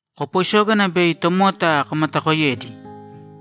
Kopoisōgana bei tomota komatakoiyedi.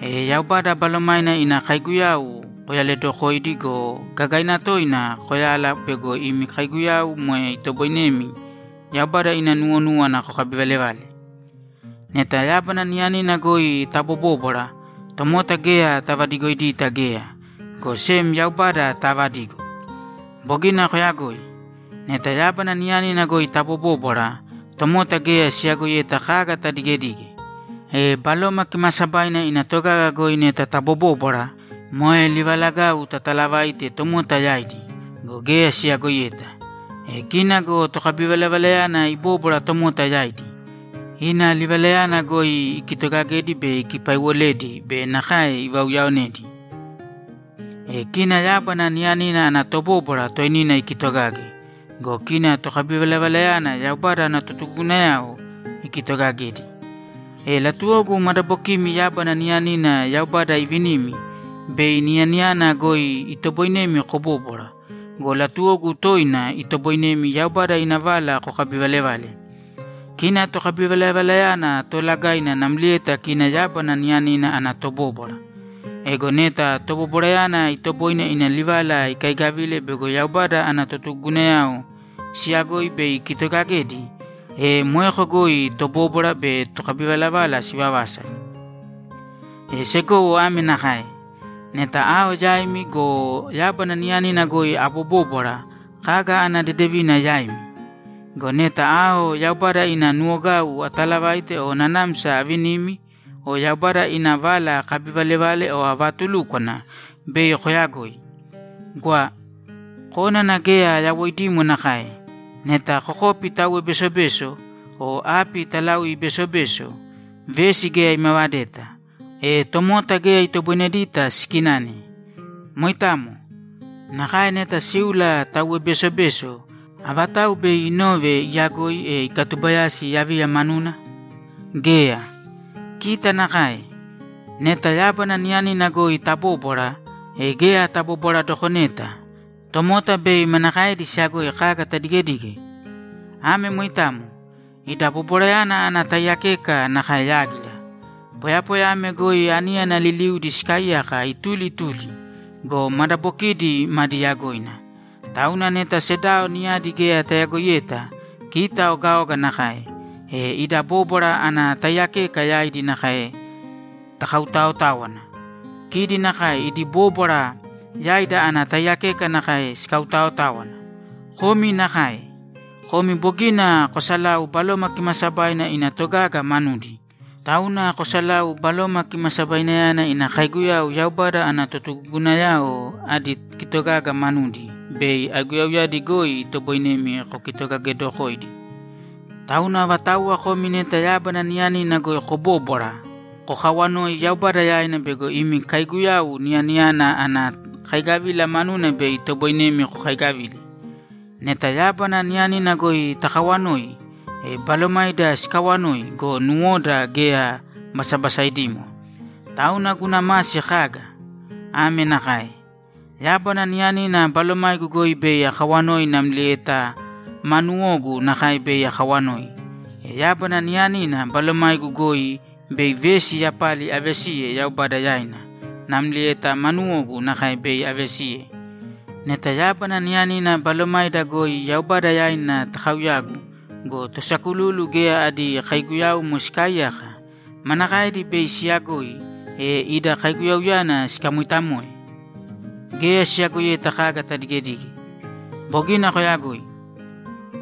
E Yaubada Balomaina ina kaiguyau koyaledokōidi go, gagaina toina koyāla bego imi kaiguyau moe itoboinemi Yaubada ina nuwonúwana kokabivalevale. Neta yábana niyanina goi tabobóbwara, tomota geya tavadigoidita geya, go sem Yaubada taavadigo. Bogina koyagoi. Neta yábana niyanina goi tabobóbwara, tomota geya siyagoiyeta kaga tadigedige. E Baloma Kimaasabaina ina togaga goi neta tabobóbwara, moe livalagau tataalavaite tomota yaidi go, geya siyagoiyeta. E kina go tokabivalavalayana ibóbwara tomota yaidi. Ina livalayana goi ikitogagedi be ikipaiwoledi be nakae ivauyaonedi. E kina yábana niyanina ana tobóbwara toinina ikitogage go, kina tokabivalavalayana Yaubada ana totugugunayao ikitogagedi. E latuwogu madabokimi yábana niyanina Yaubada iivinimi, bei niyaniyana goi itoboinemi kobóbwara go, latuwogu toina itoboinemi Yaubada ina vala kokabivalevale. Kina tokabivalavalayana toolagaina namlieta kina yábana niyanina ana tobóbwara. Ego neta tobobwarayana itoboine ina livala ikaigavile bego Yaubada ana totugugunayao siyagoi bei ikitogagedi, e moeko goi tobóbwara be tokabivalavala sivavasa. E segowo ame nakae: Neta ao yaimi go, yábana niyanina goi abobóbwara, kaga ana dedevina yaimi? Go neta ao Yaubada ina nuwogau atalavaite o nanamsa avinimi o Yaubada ina vala akabivalevale o avatulúkwana, bei koyagoi. Gwa. Kónana geya yawoidimo nakae. Neta kokopi tauwe besobeso o api talaui besobeso, vesi geya imavadeta, e tomota geya itoboinedita sikinane. Moitamo. Nakae neta síula tauwe besobeso, avatau bei inove iyagoi, e ikatubayasi yaviya manuna? Geya. Kita nakae. Neta yábana niyanina goi tabóbwara, e geya tabobwaradokoneta; tomota bei manakaedi siyagoi kaga tadigedige? Ame moitamo. Ida bobwarayana ana taiyakeka nakae yágira. Poyapoya ame goi aníyana liliudi sikaaiyaka ituli ituli go, madabokidi madi yagoina. Tauna neta sedao niyadi geya tayagoiyeta, kita ogaoga nakae, e ida bóbwara ana taiyakeka yaidi nakae takautaotáwana. Kidi nakae idi bóbwara yaida ana taiyakeka nakae sikautaotáwana. Komi nakae. Komi bogina kosalau Baloma Kimaasabaina ina togaga manudi, tauna kosalāu Baloma Kimasabainayana ina kaiguyau Yaubada ana totugugunayao adi kitogaga manudi bei aiguyauyadi goi itoboinemi kokitogagedokoidi. Tauna avatauwa komi neta yábana niyanina goi kobóbwara, kokawanōi Yaubada yaina bego imi kaiguyau niyaniyana ana kaigavila manuna bei itoboinemi kokaigavile. Neta yábana niyanina goi takawanoi, e balomaida sikawanoi go, nuwoda geya basabasaidimo. Tauna guna masi kaga? Ame nakae: Yábana niyanina balomaigu goi bei akawanoi namlieta maa nuwogu nakae bei akawanoi. E yábana niyanina balomaigu goi bei vesi yapali avesiye Yaubada yaina namlieta maa nuwogu nakae bei avesiye. Neta yábana niyanina balomaida goi Yaubada yaina takauyagu go, tosakululu geya adi kaiguyaumo sikaaiyaka, manakaedi bei siyagoi, e ida kauyaguyana sikamoitamoe? Geya siyagoiyeta kaga tadigedige. Bogina koyagoi.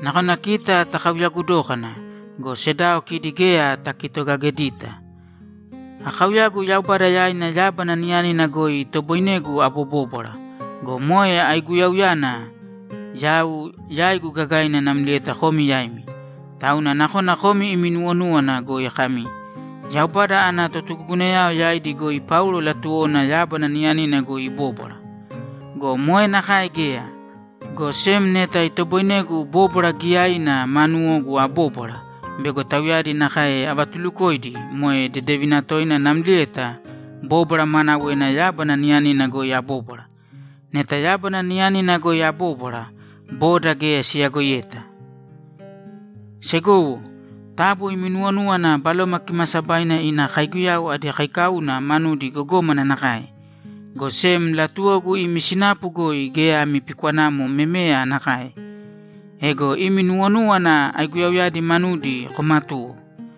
Nakona kita takauyagu dókana go, sedao kidi geya takitogagedita. Akauyagu Yaubada yaina yábana niyanina goi itoboinegu abobóbwara go, moe aiguyauyana yau yaigu gagaina namlieta komi yaimi. Tauna nakona komi imi nuwonúwana goi kami, ‘Yaubada ana totugugunayao yaidi goi Paulo latuwona yábana niyanina goi ibóbwara.’ Go moe nakae geya, go sem neta itoboinegu bóbwara giyaina ma nuwogu abóbwara bego tauyadi nakae avatulukoidi moe dedevina toina namlieta bóbwara maanawena yábana niyanina goi abóbwara. Neta yábana niyanina goi abóbwara, boda geya siyagoiyeta. Segowo, taabu imi nuwonūwana Baloma Kimaasabaina ina kaiguyau adi kaikauna manudi gogómana nakae, go sem latuwogu imi sinapu goi geya ami pikwanamo memeya nakae. Ego imi nuwonúwana aiguyauyadi manudi komatūwo.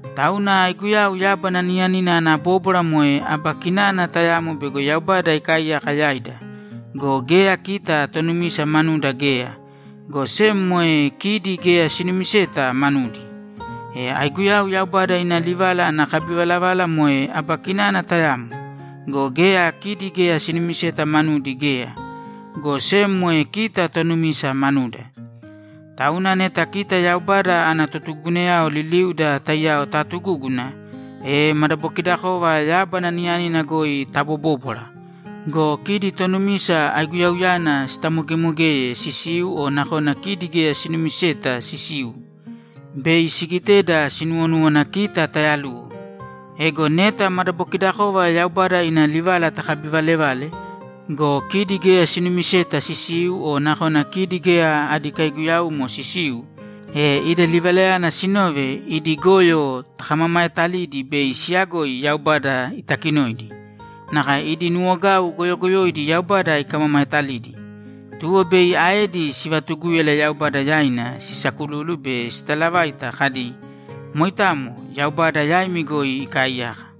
Tauna aiguyau yábana niyanina ana bóbwara moe aba kinana tayamo bego Yaubada ikaaiyaka yaida go, geya kita tonumisa manuda geya, go sem moe kidi geya sinumiseta manudi. E aiguyau Yaubada ina livala ana kabivalavala moe aba kinana tayamo go, geya kidi geya sinumiseta manudi geya, go sem moe kita tonumisa manuda. Tauna neta kita Yaubada ana totugugunayao liliuda taiyao taatugúguna, e madabokidakova yábana niyanina goi tabobóbwara go, kidi tonumisa aiguyauyana sitamogemogeye sisiu o nakona kidi geya sinumiseta sisiu, bei sigiteda sinuwonúwana kita tayaluwo. Ego neta madabokidakova Yaubada ina livala takabivaalevale go, kidi geya sinumiseta sisiu o nakona kidi geya adi kaiguyaumo sisiu, e ida livalayana sinove, idi goyo takamamaetalidi bei siyagoi Yaubada itakinoidi. Nakae idi nuwogau goyogoyoidi Yaubada ikamamaetalidi. Tuwo bei aedi sivatugúyala Yaubada yaina sisakululu be sitalavaita kadi, ‘Moitamo, Yaubada yaimi goi ikaaiyaka.’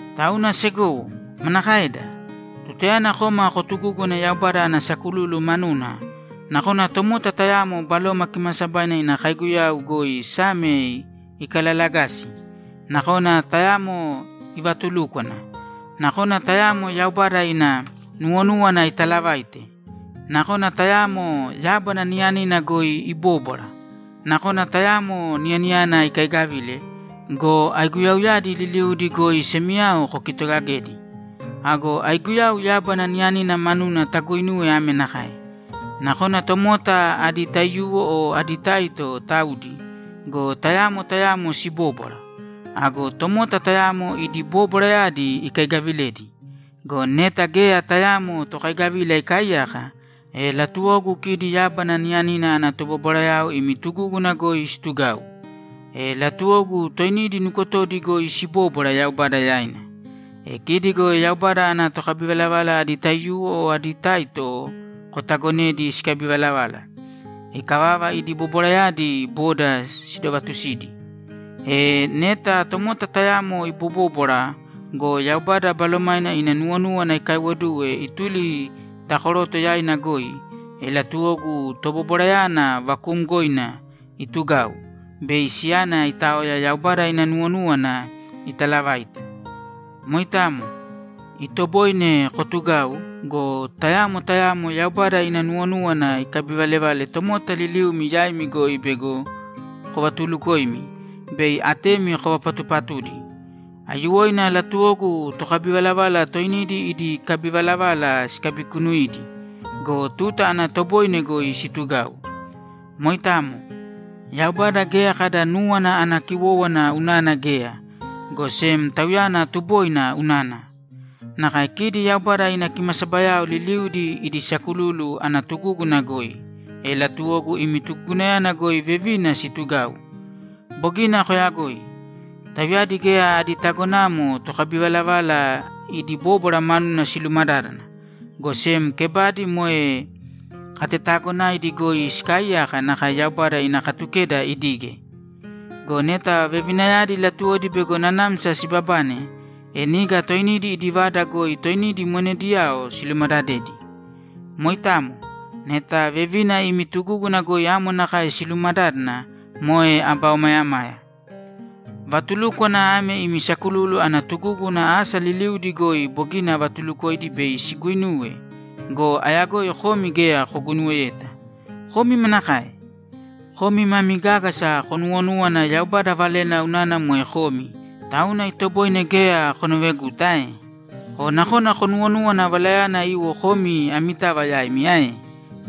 Tauna segowo, manakaeda? Tutayana koma kotugúguna Yaubada ana sakululu manuna, nakona tomota tayamo Baloma Kimaasabaina ina kaiguyau goi Same ikalalagasi, nakona tayamo ivatulúkwana, nakona tayamo Yaubada ina nuwonúwana italavaite, nakona tayamo yábana niyanina goi ibóbwara, nakona tayamo niyaniyana ikaigavile go, aiguyauyadi liliudi goi semiyao kokitogagēdi. Ago aiguyau yábana niyanina manuna taguinūwe ame nakae: Nakona tomota adi taiyuwo o adi taito taudi go, tayamo tayamo sibóbwara. Ago tomota tayamo idi bobwarayadi ikaigavilēdi. Go neta geya tayaamo tokaigavila ikaaiyaka, e latuwogu kidi yábana niyanina ana tobobwarayao imi tugúguna goi situgāu. E latuwogu toinidi nukotodi goi sibōbwara Yaubada yaina. E kidi go Yaubada ana tokabivalavala adi taiyuwo o adi taito kotagonēdi sikabivalavala. Ikavava, idi bobwarayadi boda sidovatusīdi. E, neta tomota tayamo ibobóbwara go, Yaubada Balomaina ina nuwonúwana ikaiwoduwe ituli ta koroto yaina goi, e latuwogu tobobwarayana vakuumgoina itugāu bei siyana itaoya Yaubada ina nuwonúwana italavaite. Moitamo. Itoboine kotugau go, tayamo tayamo Yaubada ina nuwonúwana ikabivalevale tomota liliumi yaimi goi bego kovatulukoimi be atemi kovapatupatudi. Aiyuwoina latuwogu tokabivalavala toinidi idi kabivalavala sikabikunuīdi go, tuta ana toboine goi situgāu. Moitamo. Yaubada geya kada núwana ana kiwówana unana geya, go sem Tauyana tuboina unana. Nakae kidi Yaubada ina kimasabayao liliudi idi sakululu ana tugúguna goi, e latuwogu imi tugugunayana goi vevina situgāu. Bogina koyagoi. Tauyadi geya adi tagonamo tokabivalavala idi bóbwara manuna silumadádana, go sem kebadi moe katetaagonaidi goi sikaaiyāka nakae Yaubada ina Katukeda idige. Go neta vevinayadi latuwodi bego nanamsa sibabane, e niga toinidi idi vada goi toinidi monediyao silumadadēdi. Moitamo. Neta vevina imi tugúguna goi amo nakae silumadádana, moe aba omayamaya. Vatulúkwana ame imi sakululu ana tugúguna asa liliudi goi bogina avatulukoidi bei siguinuwe go, ayagoi komi geya koguinuweyeta. Komi manakae? Komi mami gágasa konuwonúwana Yaubada valena unana moe komi, tauna itoboine geya konoveguta ae? O nakona konuwonúwana valayana iwo komi amitava yaimi ae?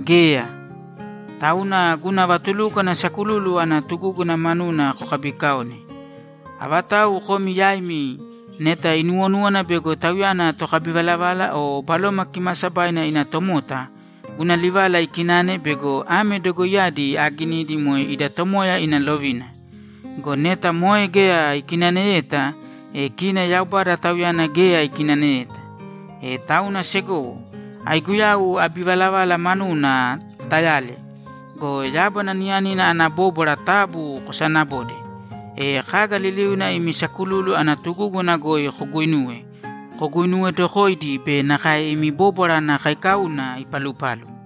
Geya. Tauna guna vatulúkwana sakululu ana tugúguna manuna kokabiikaōne. Avatau komi yaimi neta inuwonúwana bego tauyana tokabivalavala o Baloma Kimaasabaina ina tomota, guna livala ikināne bego ame dogoiyadi aaginidi moe ida Tomoya ina lovina. Go neta moe geya ikinaneyeta, e kina Yaubada tauyana geya ikinaneyeta. E tauna segowo, aiguyau abivalavala manuna tayāle go, yábana niyanina ana bóbwara taabu kosaanabōde. E kaga liliuna imi sakululu ana tugúguna goi koguuinuwe, koguinuwedokōidi be nakae imi bóbwara ana kaikauna ipalupalu.